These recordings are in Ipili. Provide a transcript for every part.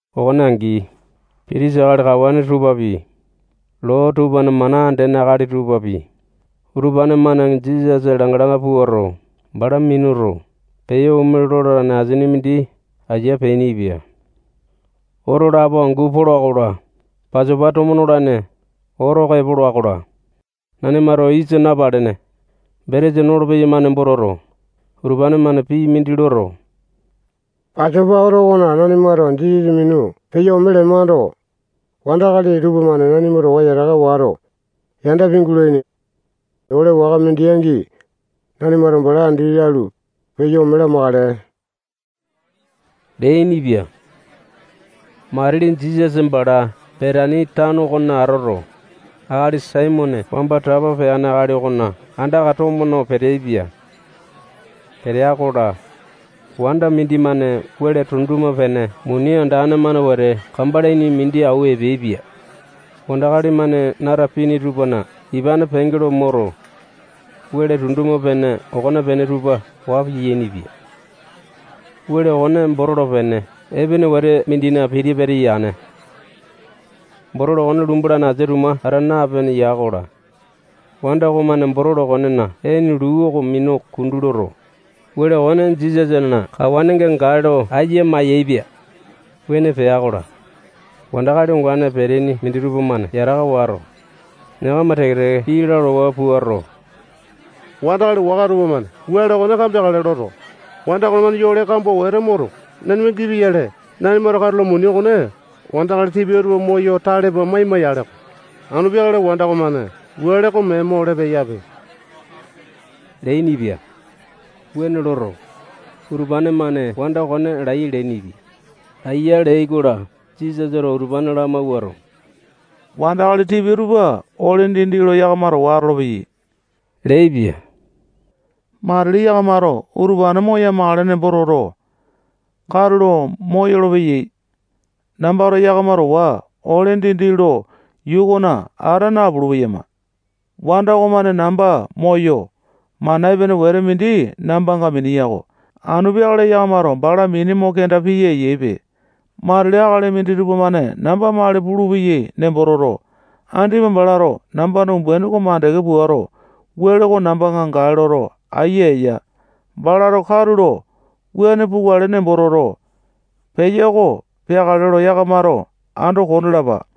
Okone angi, pitisa akali kawane tupapi, loo tupana mana andene akali tupapi, utupane-mane Jisasa langa-langa puato, bala minuto, peyo ome lolane asini mindi aiya peainipia. Oto lapo angu pola-kola, Pasopa tomo nolane oto oko epola-kola, nanimato yisa napalene betesa nolo-peyama nembo toto, utupane-mane pii mindi loto, Pasopa oto okona nanimato Jisasa minu peyo ome lemando, wandakali tupamane nanima towa yataka wato, yanda pingulaini. Ole waka mindi angi, nanimato bala andi lalu, peyo ome lamakale leainipia. Matili Jisasa bala Betani tano okona atoto, akali Saimone wamba tapa peane akali okona andaka tomo no peteaipia. Petea-kola, wanda mindimane wele tunduma-pene muni andane-mane wete kambalaini mindi awua epeaipia. Wandakali-mane nata pini tupana ipane penge lo moto, wele tunduma-pene okonepene tupa waa piyainipia. Wele okone botolo pene epene wete mindina piti-pata yane. Botolo okone lumbolane asia tuma ata napene ya-kola, wanda okomane botolo okonena ene luu oko minu kundu loto, wele okone Jisasana kawanenga gae lo aiya mayaepia. Wuane pea-kola, wandakali ongane peteaini minditupa-mane yataka wato, yakama teke-teke pii lalawa puato, wandakali waka tupamane wele okone kambeakale loto, wanda okomane yole kambua wete moto, nanima gipia-yale, nanimato katulo muni okone wandakali tipia tupa moyo tale pua maima-yaleko. Anu peakale wanda okomane wele oko mee mo ole peyape leainipia. Wuane loto, utupane-mane wanda okone laiya leainipia. Laiya leai-kola, Jisasato utupane lamawuato, wandakali tipia tupa ole dindi lo yakama towa atolopeyai leaipia. Matili yakamato utupane moya-makale nembo toto, katulo moyolo-peyai. Namba yakama towa ole dindi lo yuu okona ata napulu-peyama. Wanda okomane namba moyo, mana epene wete mindi nambanga mineya-ko. Anu peakale yakamato bala mini mo kenda piya eyaipe. Matili akali minditupa-mane namba mali pulupeyai nembo toto, andipa balato nambana umbuaini oko mandeke puato, wele oko nambanga gae loto, aiya eya. Balato katulo wuane pukale nembo toto, peya oko peakale lo yakamato ando kondalapa.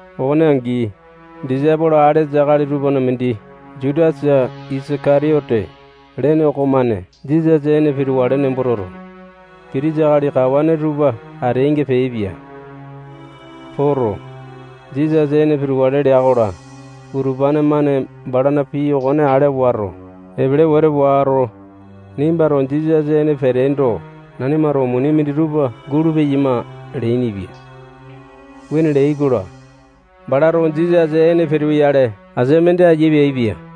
Okone angi, disaipolo alesa akali tupana mindi Jutasa Isaka-tiyote lene okomane Jisasa ene pitukale nembo toto, pitisa akali kawane tupa ateainga peaipia. Poto, Jisasa ene pitukale lea-kola, utupane-mane balana pii okone ale wato, epele wete wato, nimbato Jisasa ene peteendo, nanimato muni minditupa gulupeyama leainipia. Wuane leai-kola, balato Jisasa ene pituyale asia mindi aiya peaipia.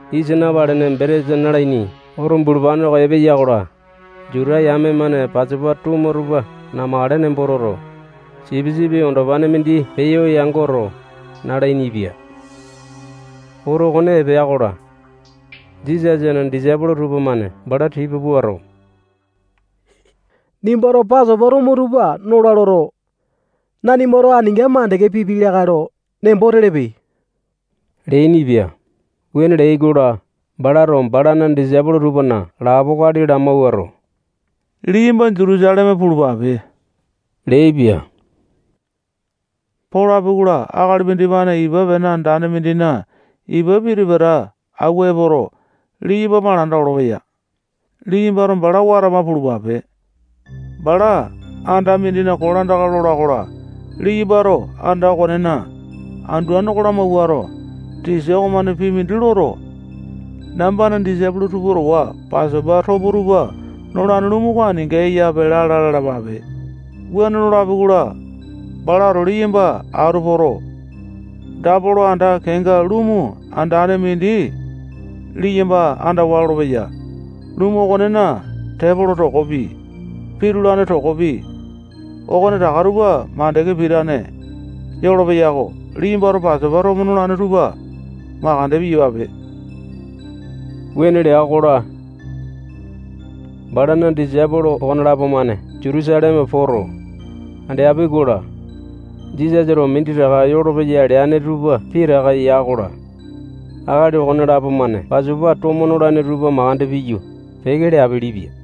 Yisa napalene betesa nalaini oto bulupane oko epeya-kola, Juta yame-mane Pasopa tomo tupa namakale nembo toto, sipisipi andopane mindi peyo yangoto, nalainipia. Oto okone epea-kola, Jisasana disaipolo tupamane bala tipa puato, nimbato Pasopa tomo tupa nola loto, nanimato aninga mandeke pipiai lakae lo nembo telepe leainipia. Wuane leai-kola, balato balana disaipolo tupana lapo akali lamawuato, liyamba Jutusaleme pulupape leaipia. Polapi-kola, akali mindimane ipa pene andane mindina ipa piti-pata awua epoto, liyamba malanda olopeya. Liyambato bala watama pulupape. Bala anda mindina kolandaka lola-kola, liyambato anda okonena anduane oko lamawuato, tisa okomane pii mindi loto, nambana disaipolo tupa towa Pasopa tomo tupa nolane lumu oko aninga eyape lala lalapape. Wuane lolapi-kola, balato liyamba atu poto, dapolo anda kenga lumu andane mindi liyamba andawa lolopeya. Lumu okonena tepolo tokopi, pitulane tokopi, okonetaka tupa mandeke pitane yolopeya-ko. Liyambato Pasopa tomo nolane tupa mandeke piyapape. Wuane lea-kola, balana disaipolo okonelapo-mane Jutusaleme poto, andeapi-kola, Jisasato minditaka yolopeya leane tupa pitaka ya-kola, akali okonelapo-mane Pasopa tomo nolane tupa mandeke piyu, peke leapelepia.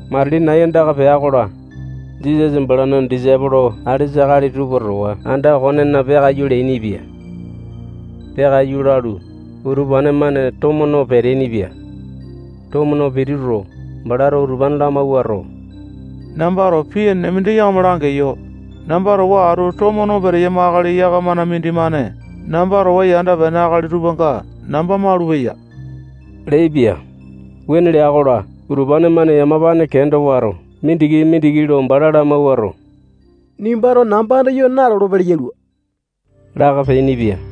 Matili nai andaka pea-kola, Jisasa balana disaipolo alesa akali tupa towa anda okonena peakaiyu leainipia. Peakaiyu lalu, utupane-mane tomo no peteaini-pia. Tomo no pituto, balato utupane lamawuato, nambato pii enene mindi yakama langeyo. Namba towa atu tomo no peteyama akali yakamana mindimane namba towa yanda pene akali tupanga namba malupeya leaipia. Wuane lea-kola, utupane-mane yamapane kenda wato, mindiki-mindiki lo bala lamawuato, nimbato namba andayo nalolo-pele yalua laka peainipia.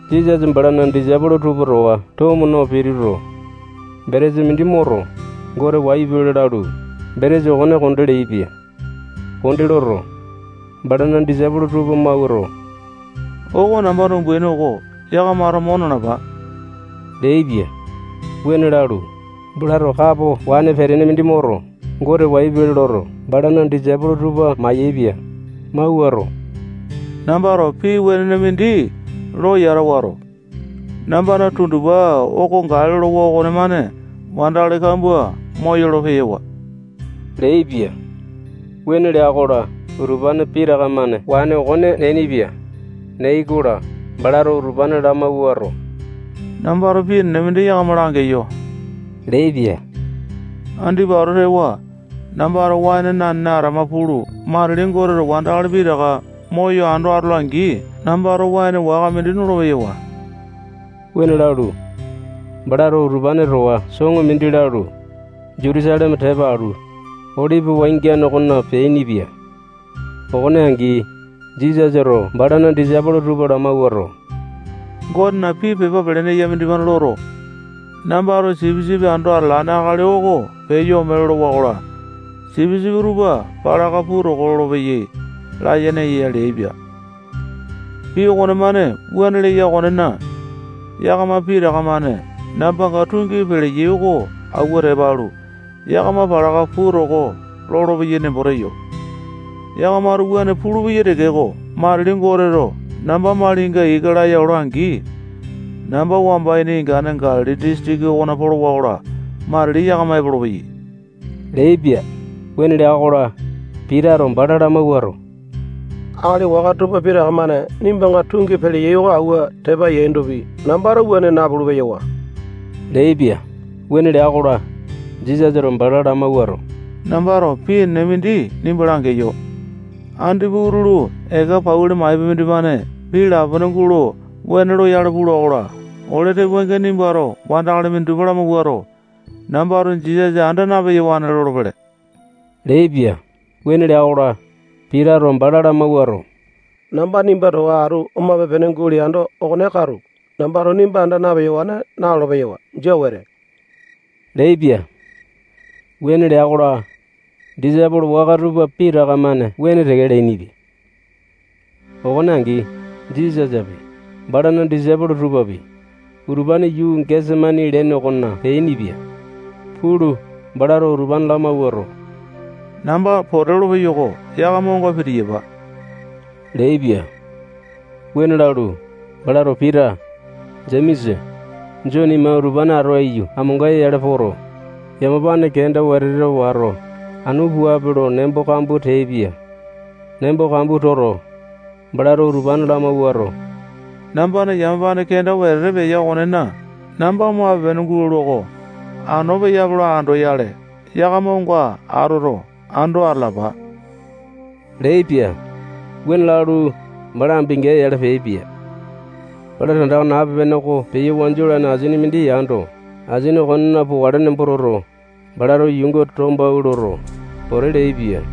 Jisasa balana disaipolo tupa towa tomo no pituto, betesa mindi moto, Gote wayu pele lalu, betesa okone konde leaipia. Konde loto, balana disaipolo tupa mawuato, oko nambana umbuaini oko. Yakamato mo nalapa leaipia. Wuane lalu, balato kapo waene petene mindi moto, Gote wayu pele loto, balana disaipolo tupa mai-yaepia. Mawuato, nambato pii wenene mindi lo yata wato, nambana tundupa oko gae lolowa okomane wandakali kambua moyolo-peyawa leaipia. Wuane lea-kola, utupane pitaka-mane waene okone neainipia. Neai-kola, balato utupane lamawuato, nambato pii enene mindi yakama langeyo leaipia. Andipa ato tewa, nambato waene nanene atama pulu, matili Goteto wandakali pitaka moyo ando atola-angi, nambato waene waka mindi nolo-peyawa. Wuane lalu, balato utupane towa soŋo mindi lalu, Jutusaleme tepa alu, Olipi wangiane okona peainipia. Okone angi, Jisasato balana disaipolo tupa lamawuato, Gotena pii pepa pelene eya mindimane loto, nambato sipisipi ando atalane akali oko peyo ome lolowa-kola, sipisipi tupa palaka puu toko lolopeyai layene eya leaipia. Pii okonemane wuane leya okonena, yakama pitaka-mane nambanga tungi peleyai oko awua tepa alu, yakama palaka puu toko lolopeyai nembo teyo. Yakamato wuane pulupeyai tekeko, matili Goteto namba malinga ika laya ola-angi, namba wamba ini ingane Galili disitiki okona polowa-kola, matili yakama epolopeyai leaipia. Wuane lea-kola, Pitato bala lamawuato, akali waka tupa pitaka-mane nimbanga tungi peleyai oko awua tepa yaindopi, nambato wuane napulu-peyawa leaipia. Wuane lea-kola, Jisasato bala lamawuato, nambato pii enene mindi nimba langeyo. Andipa utulu, eka pauli maipa mindimane pii lapone gulo wene loyale pula-kola, ole tepoainga nimbato wandakali minditupa lamawuato, nambato Jisasa anda na-peyawane lolopele leaipia. Wuane lea-kola, Pitato bala lamawuato, namba nimba towa atu omape-pene guleando, okone katu. Nambato nimba anda na-peyawane nalolo-peyawa. Jia wete leaipia. Wuane lea-kola, disaipolo waka tupa pitaka-mane wuane teke leainipia. Okone angi, Jisasapi, balana disaipolo tupapi, utupane yuu Gesemani lene okona peainipia. Pulu, balato utupane lamawuato, namba pote lolo peyo-ko. Yakama onga pitiyapa leaipia. Wuane lalu, balato Pita, Jemesa, Jone ima utupane atu aiyu amonga-yale poto, yamapane kenda wetete wato, anu puape lo nembo kambua teaipia. Nembo kambua toto, balato utupane lamawuato, nambana yamapane kenda wetete peya okonena, namba omape-pene gulalua-ko. Anu peyape lo andoyale, yakamato onga atoto, ando atalapa leaipia. Wuane lalu, bala ambinga-yale peaipia. Bala tandaka nape-pene oko peyo wanju olane asini mindi yando, asini okonena pokale nembo toto, balato yuunga tombawua loto, pote leaipia.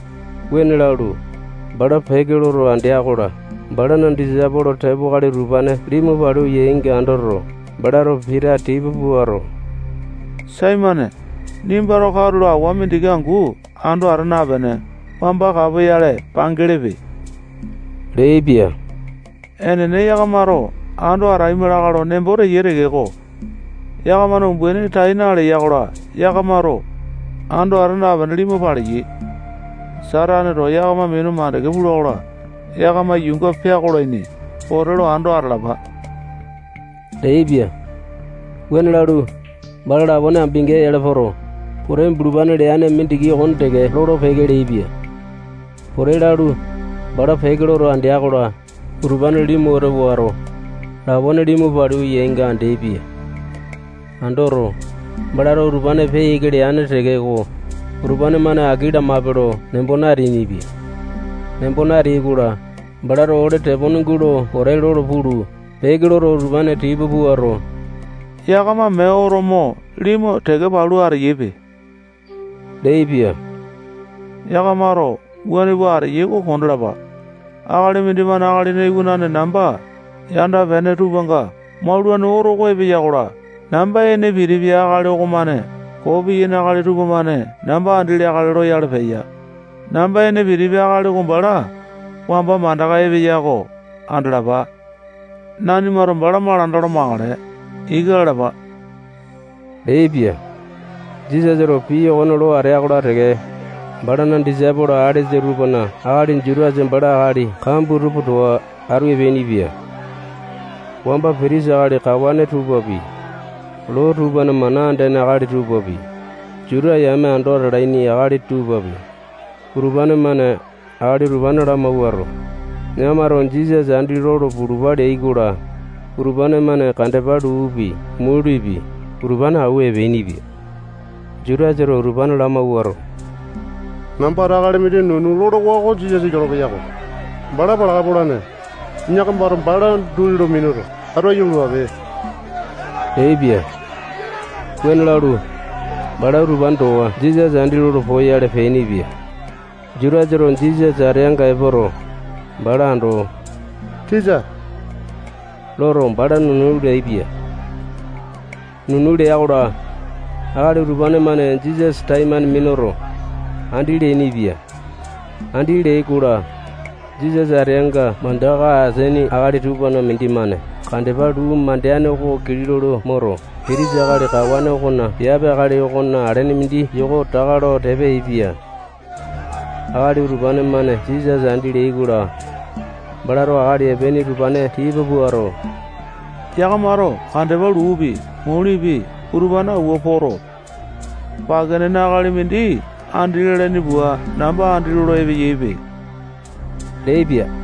Wuane lalu, bala peke loto andea-kola, balana disaipolo tepo akali utupane limu palu yainga andoto, balato Pita tipa puato, Saimone, nimbato katulo awa mindiki angu ando ata napene, wamba kapoyale pangelepe leaipia. Enene, yakamato ando ataima lakae lo nembo teyai tekeko, yakamana umbaini tai naleya-kola, yakamato ando ata napene, limu paleyai. Sataneto yakama minu mandeke pula-kola, yakama yuunga peakolaini. Pote lo ando atalapa leaipia. Wuane lalu, bala lapone ambinga-yale poto, pote bulupane leane mindiki okone teke lolo-peke leaipia. Pote lalu, bala peke loto andea-kola, utupane limu wete wato, lapone limu palu yainga andeaipia. Andoto, balato utupane peya ika leane tekeko, utupane-mane aki lamape lo nembo nateainipia. Nembo nateai-kola, balato ole tepone gulo pote lolo pulu, peke loto, utupane tipa puato, yakama mee oto mo limu teke palu ateyaipe leaipia. Yakamato wuane pua ateyai oko kondalapa. Akali mindimane Akalina Iwanane namba yanda pene tupanga maulane oto oko epeya-kola, namba ene pitipia akali okomane koo piyaini akali tupamane namba andi leakale loyale peya. Namba ene pitipia akali oko bala wamba mandaka epeya oko andalapa. Nanimato bala malanda olo makale. Ika lalapa leaipia. Jisasato pii okone lo atea-kola teke, balana disaipolo alesa tupana akali Jutasa bala akali kambua tupa towa atu epeainipia. Wamba pitisa akali kawane tupapi, loo tupana mana andene akali tupapi, Juta yame ando atalaini akali tupapi, utupane-mane akali utupane lamawuato, yakamato Jisasa andi lolo pulupa leai-kola, utupane-mane kandepa luupi, mulipi, utupane awua epeainipia. Jutasato utupane lamawuato, nambato akali mindi nunu lolowa oko Jisasa yolopeya-ko. Bala palaka polane. Yakamato bala duli lo minuto, atu aiyu pulupape leaipia. Wuane lalu, bala utupane towa Jisasa andi lolo poyale peainipia. Jutasato Jisasa ateanga epoto, bala ando, tisa loto, bala nunu leaipia. Nunu lea-kola, akali utupane-mane Jisasa taimane minuto, andi leainipia. Andi leai-kola, Jisasa ateanga mandaka ateaini akali tupana mindimane kandepa luu mandeane oko kilau lo moto, pitisa akali kawane okona piape akali okona alene mindi yoko taka lo tepa yaepia. Akali utupane-mane Jisasa andi leai-kola, balato akali epeaini utupane tipa puato, yakamato kandepa luupi, mulipi, utupane awua poto, pake nene akali mindi andi lalaini pua, namba andi lolo epeyaipe leaipia.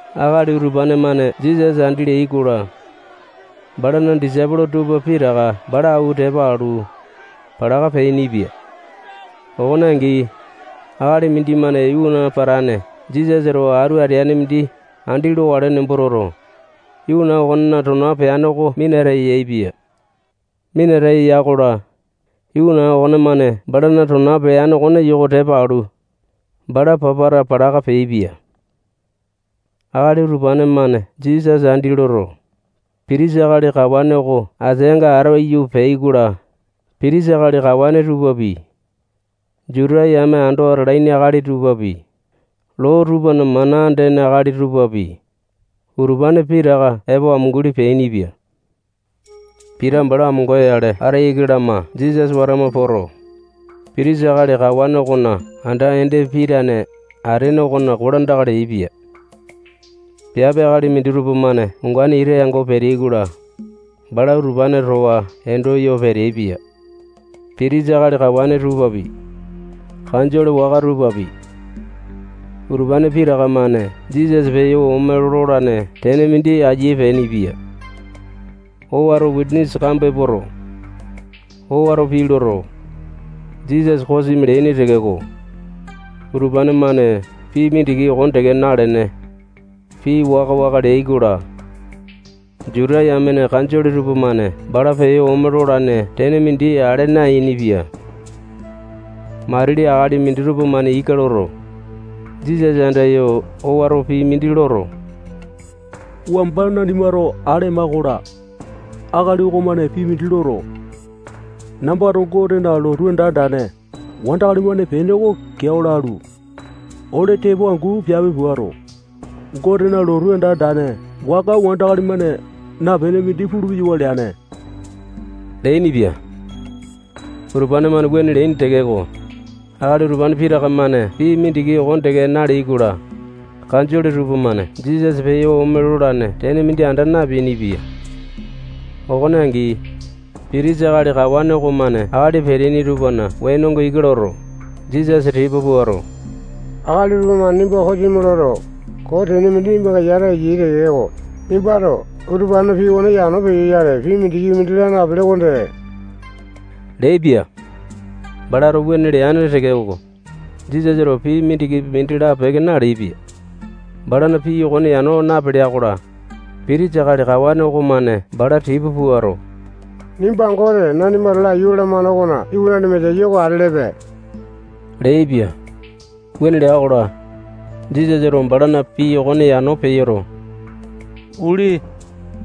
Akali utupane-mane Jisasa andi leai-kola, balana disaipolo tupa pitaka bala awua tepa alu, palaka peainipia. Okone angi, akali mindimane iwana patane Jisasa towa atu ateane mindi andi lokale nembo toto, iwana okonena tona peane oko minata yaepia. Minata ya-kola, iwana okonemane balana tona peane okone yoko tepa alu, bala papata palaka peaipia. Akali utupane-mane Jisasa andi loto, pitisa akali kawane oko ateanga atu aiyu peai-kola, pitisa akali kawane tupapi, Juta yame ando atalaini akali tupapi, loo tupana mana andene akali tupapi, utupane pitaka epo amunguli peainipia. Pita bala amonga-yale ata iki lama Jisasa watama poto, pitisa akali kawane okona anda ende pitane atene okona kolandaka leaipia. Piape akali minditupa-mane ongane ita yango peteai-kola, bala utupane towa endo yo peteaipia. Pitisa akali kawane tupapi, kanjole waka tupapi, utupane pitaka-mane Jisasa peyo ome lolane tene mindi aiya peainipia. Owato wisanisa kambua epoto, owato pii loto, Jisasa kosimi leaini tekeko, utupane-mane pii mindiki okone teke nalene, pii waka-waka leai-kola, Juta yamena kanjole tupamane bala peyo ome lolane tene mindi ale nayainipia. Matili akali minditupa-mane ika loto, Jisasa andayo owato pii mindi loto, wamba nanimato ale ema-kola, akali okomane pii mindi loto, nambato Gotena lotu anda andane wandakali-mane pene oko keao lalu, ole tepo angu piape puato, Gotena lotu anda andane waka wandakali-mane napene mindi pulu-peyawa leane leainipia. Utupane-mane wuane leaini tekeko, akali utupane pitaka-mane pii mindiki okone teke naleai-kola, kanjole tupamane Jisasa peyo ome lolane tene mindi anda napeainipia. Okone angi, pitisa akali kawane okomane akali peteaini tupana wenonga ika loto, Jisasa tipa puato, akali utupa-mane nimba kosimi loto, koo tene mindi nimbanga yata eyai tekeko, nimbato utupanena pii okone yano peyoyale, pii mindikipi mindi laa napele okonde leaipia. Balato wuane leane tekeko, Jisasato pii mindikipi mindi lapeke naleaipia. Balana pii okone yano napelea-kola, pitisa akali kawane okomane bala tipa puato, nimba Gote nanimato laiyu lalamane okona iwanane Mesaya oko atelepe leaipia. Wuane lea-kola, Jisasato balana pii okone yano peyoto, uli.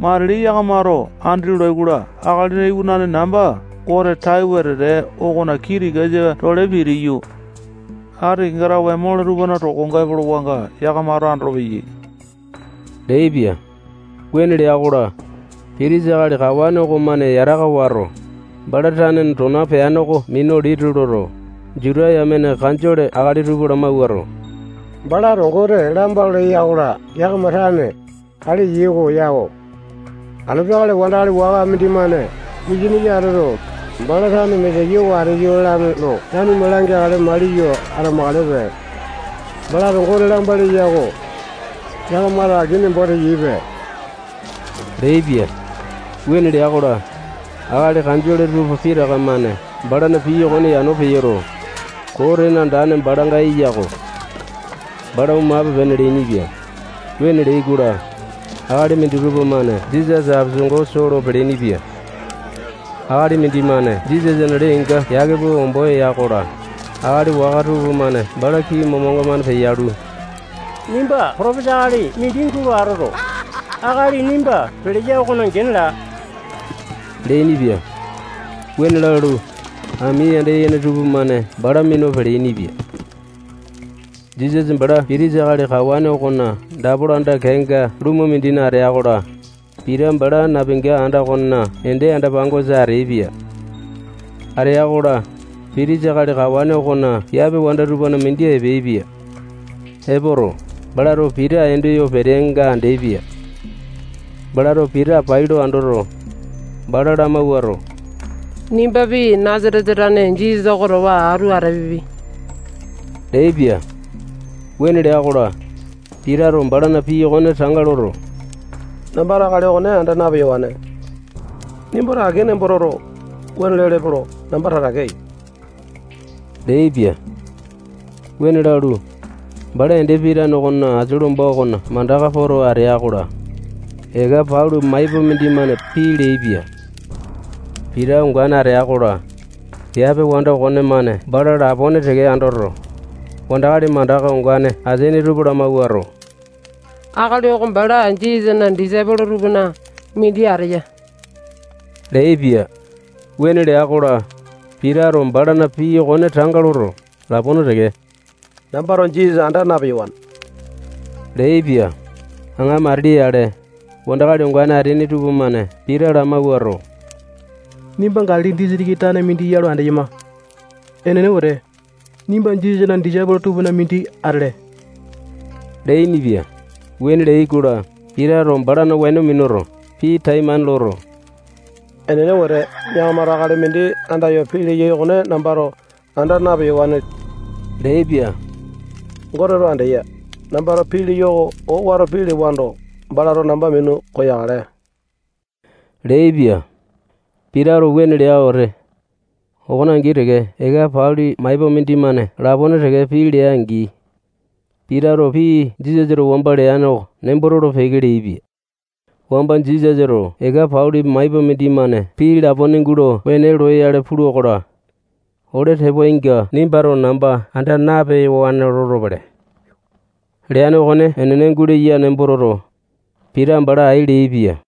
Matili yakamato andolai-kola, Akalina Iwanane namba Gote tai wetete okona kii tikasa-tole pitiyu, atinga kenga tawe mole tupana tokonga epolowanga yakamato andolopeyai leaipia. Wuane lea-kola, pitisa akali kawane okomane yataka wato, bala tanena tona peane oko minu liti loto, Juta yamena kanjole akali tupa lamawuato, balato Gote lamba leya-kola, yakama tane ale eyai oko yako. Anu peakale wandakali waka mindimane wisanisa atoto, bala tane Mesaya oko ateyo lalane lo nanima langeakale maliyo atamakalepe. Balato Gote lamba leya-ko. Yakamato aki nembo teyaipe leaipia. Wuane lea-kola, akali kanjole tupa pitaka-mane balana pii okone yano peyoto, koo tene andane balanga eya-ko. Bala omape-pene leainipia. Wuane leai-kola, akali minditupa-mane Jisasa apesango soo lo peleaini-pia. Akali mindimane Jisasana lee-inga yake pua ombo ya-kola, akali waka tupamane bala kii momanga-mane peyalu, nimba potopesa akali mindi gulo atoto, akali nimba peleya okona gene laa leainipia. Wuane lalu, ami yanda yene tupamane bala minu peleaini-pia. Jisasa bala pitisa akali kawane okona dapolo anda kenga lumu mindina atea-kola, Pita bala napinga anda okonena ende anda-pangosa ateaipia. Atea-kola, pitisa akali kawane okona piape wanda tupana mindi epeaipia. Epoto, balato Pita endo yo peteanga andeaipia. Balato Pita pai lo andoto, bala lamawuato, nimbapi, Nasatesa tane Jisasa oko towa atu atapiapi leaipia. Wuane lea-kola, Pitato balana pii okone tanga loto, nambato akali okone anda na-peyawane. Nimbato aki nembo toto, wuane lelepe lo namba tatake eyo leaipia. Wuane lalu, bala ende pitane okona asia lomba okona mandaka poto atea-kola, eka pauli maipa mindimane pii leaipia. Pita ongane atea-kola, piape wanda okonemane bala lapone teke andoto, wandakali mandaka ongane ateaini tupa lamawuato, akali oko bala Jisasana disaipolo tupana mindi ateya leaipia. Wuane lea-kola, Pitato balana pii okone tanga loto, lapone teke nambato Jisasa anda na-peyawane leaipia. Aŋa matili yale, wandakali ongane ateaini tupamane Pita lamawuato, nimba Galili disitiki tane mindi ya lo andeyama. Enene wete, nimba Jisasana disaipolo tupana mindi atele leainipia. Wuane leai-kola, Pitato balana weno minuto, pii taimane loto, enene wete, yakamato akali mindi andayo pii leyai okone nambato anda na-peyawane leaipia. Goteto andeya. Nambato pii leyo oko owato pii lewando, balato namba minu koyakale leaipia. Pitato wuane lea wete, okone angi teke eka pauli maipa mindimane lapone teke pii lea-angi, Pitato pii Jisasato wamba leane oko nembo tolo-peke leaipia. Wamba Jisasato eka pauli maipa mindimane pii lapone gulo wene loyale pula-kola, ole tepoainga nimbato namba anda na-peyawane lolopele leane okone enene guleya nembo toto, Pita bala ai leaipia.